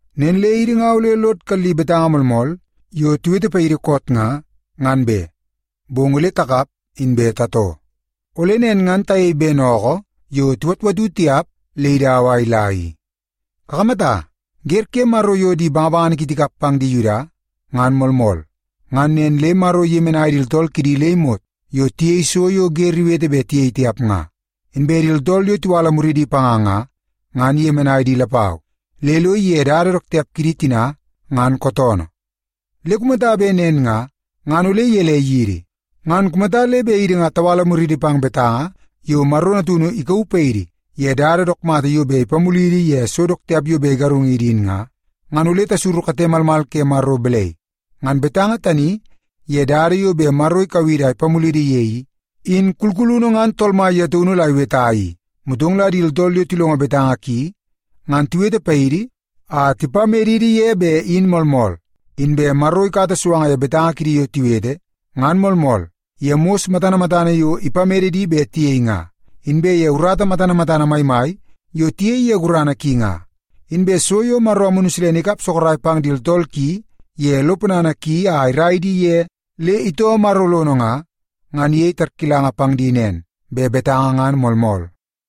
Nen le idi nga ole lod kalli betanga moolmool yo tiwete paidi koot nga, ngan be, bong ole takap inbe tatoo. Ole nen ngan tayei ben ookoo yo tiwatwatu tiap le idau a ila i. Kakamata, wer ke Maro yo di bangabangana ki tikap pang di Yuda ngan moolmool, ngan nen le Maro iyemenai di tooltool kidi le imot yo tiyei so yo wer iwete bet tiyei tiap nga. Inbe di tooltool yo tiwala muridi panga nga, ngan iyemenai di lapau, le lo ige dada dook tiap kidi tina ngan kootoonoo. Le kumata bet nen nga, ngan ole gelei yidi? Ngan kumata le bet idi nga tawala muriidi pang betanga yo Maro Natunu ikauu paidi ye dada dook mata yo bet ipamulidi ye so dook tiap yo bet igarungidi in nga, ngan ole tasuru kate malmal ke Maro balai? Ngan betanga tani ye dada yo bet Maro ikau idi a ipamulidi ye i, in kulkulunu ngan Tool Mai ye taunu la iweta i, motong la di tooltool yo tilongo betanga ki, ngan tiwete paidi a tipamedidi ye bet in moolmool. Inbe Maro ikata suanga ye betanga kidi yo tiwete, ngan moolmool, ye mos matana matana yo ipamede di bet tiyei nga, inbe ye urata matana matana maimai yo tiyei ye gurana ki nga. Inbe so yo Maro Amunu Silene ikap sorok pang di tooltool ki ye lo ponana ki a irai di ye le itoo Maro lono nga, ngan iyei tarkilanga pang di nen, bet betanga ngan moolmool.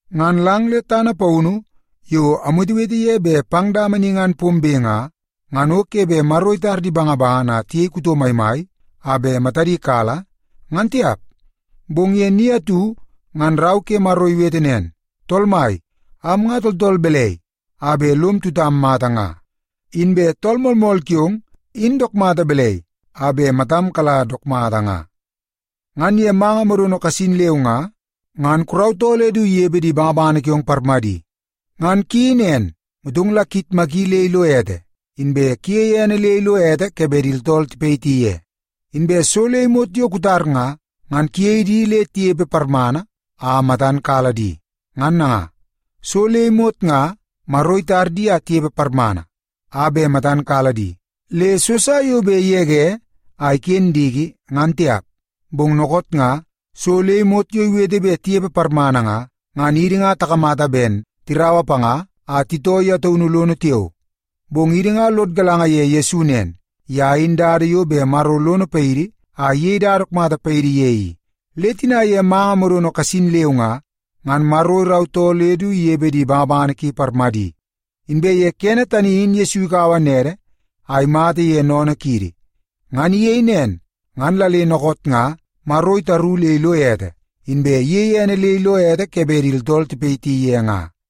Ngan lang le tana paunu yo amwetewete ye bet pang dama ni ngan pombe nga, ngan o ke bet Maro itar di bangabangana a tiyei kuto maimai a bet matadi kala, ngan tiap. Bong ye ni atu ngan Rau ke Maro iwete nen, “Tool Mai, am nga tooltool balai a bet lom tutam mai mata nga? Inbe tool moolmool kiong in dook mata balai a bet matam kala dook mata nga? Ngan ye manga modono kasin leu nga, ngan kurautoo le du inepe di bangabangana kiong parmadi. Ngan kuyeii nen, motong la kuyitmaki le ilo ete, inbe kuyei ene le ilo ete ke bet di tooltool tipayiti ye. Inbe so le imot yo kutar nga, ngan kuyei di le tinepe parmana a matan kala di.” Ngan nanga, so le imot nga Maro itar di a tinepe parmana a bet matan kala di, le so sa yo bet igege a iken diki, ngan tiap. Bong dookoot nga so le imot yo iwete bet tinepe parmana nga, ngan idi nga takamata ben tiraua panga a titoo ye taunu lono tiao. Bong idi nga lod galanga ye Yesu nen, ye in dada yo bet Maro lono paidi a iyei dada dook mata paidi ye i. Le tina ye manga modono kasin leu nga, ngan Maro irautoo le du inepe di bangabangana ki parmadi. Inbe ye kene tani in Yesu ikaua nede a imata ye sennene kiidi. Ngan iyei nen, ngan la le dookoot nga Maro itaru le ilo ete, inbe iyeie ene le ilo ete ke bet di tooltool tipayiti ye nga.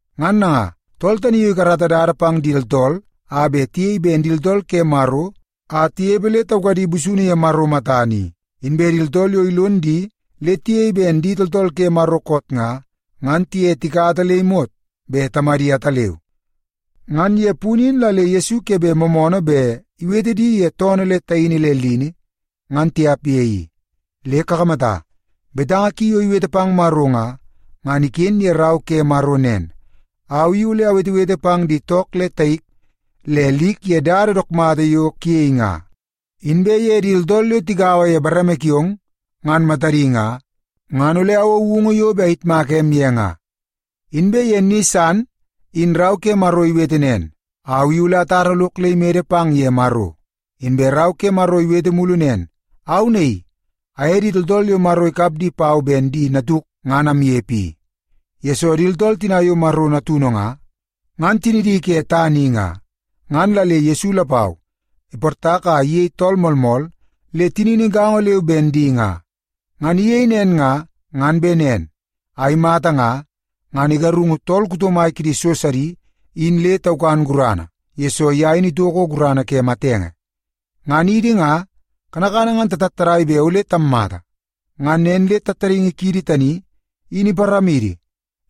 Ngan nanga, tool tani yo ikarata dada pang di tooltool a bet tiyei ben di tooltool ke Maro a tinepe le taukadi busunu ye Maro matana i, inbe di tooltool yo ilon di le tiyei ben di tooltool ke Maro koot nga, ngan tiye tikata le imot bet Tamadi ataleu. Ngan ye punu in la le Yesu ke bet moomoonoo bet iwete di ye toonoo le taini le lini, ngan tiap ye i. Le kakamata, betanga ki yo iwete pang Maro nga, ngan iken ye Rau ke Maro nen, “Au i ole awetewete pang di took le taik le lik ye dada dook mata yo kuyei nga. Inbe ye di tooltool yo tigaua ye bareme kiong, ngan matadi nga, ngan ole awou woungu yo bet ayitmaka em ye nga.” Inbe ye ni san in Rau ke Maro iwete nen, “Au i ole atara lok le imede pang ye Maro.” Inbe Rau ke Maro iwete mulu nen, “Au naii, aye di tooltool yo Maro ikap di pau ben di natuk ngan amnepe i.” Yesoo di tooltool tina yo Maro natunu nga, ngan tinidi ke tana i nga, ngan la le Yesu lapau iportak a iyei tool moolmool le tinini gaongo leu ben di nga. Ngan iyei nen nga, ngan bet nen a imata nga, ngan igarungu tool kuto mai kidi so sidi in le taukan gurana, yesoo ye in itoko gurana ke matenge. Ngan idi nga, kanakana ngan tatattadai bet ole tammata. Ngan nen le tattadaingi kiidi tani in iparamidi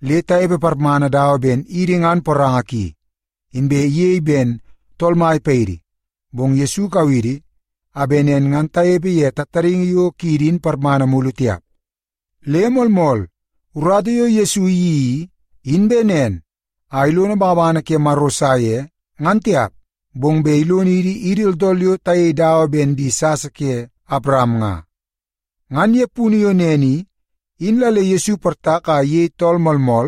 le tanepe parmana dawa ben idi ngan poranga ki, inbe iyei ben tool mai paidi. Bong Yesu ikau idi a bet nen ngan tanepe ye tattadaingi yo kiidi in parmana mulu tiap. Le moolmool, urata yo Yesu iyeii i, in bet nen a ilono bangabangana ke Maro sa ye, ngan tiap, bong bet ilonidi idi tooltool yo tayei dawa ben di sasa ke Awaram nga. Ngan ye punu yo nen i, in la le Yesu iportak a iyei tool moolmool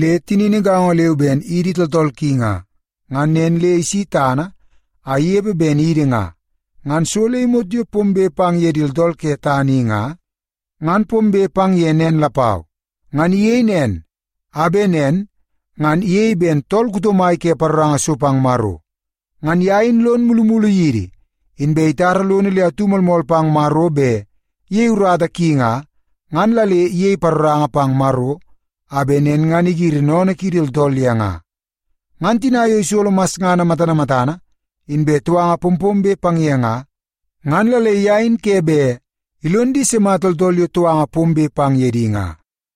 le tinini gaongo leu ben idi tooltool ki nga. Ngan nen le isi tana a inepe ben idi nga, ngan so le imot yo pombe pang ye di tooltool ke tana i nga, ngan pombe pang ye nen lapau. Ngan iyei nen, a bet nen ngan iyei ben tool kuto mai ke paroranga so pang Maro. Ngan ye in lon mulumulu yidi, inbe itara lono le atu moolmool pang Maro bet iyei urata ki nga, ngan la le iyei paroranga pang Maro a bet nen ngan igiri sennene kiidi tooltool ye nga. Ngan tina yo isolo masngana matana matana, inbe touanga pompombe pang ye nga, ngan la le ye in ke bet ilon di sima tooltool yo touanga pombe pang ye di nga.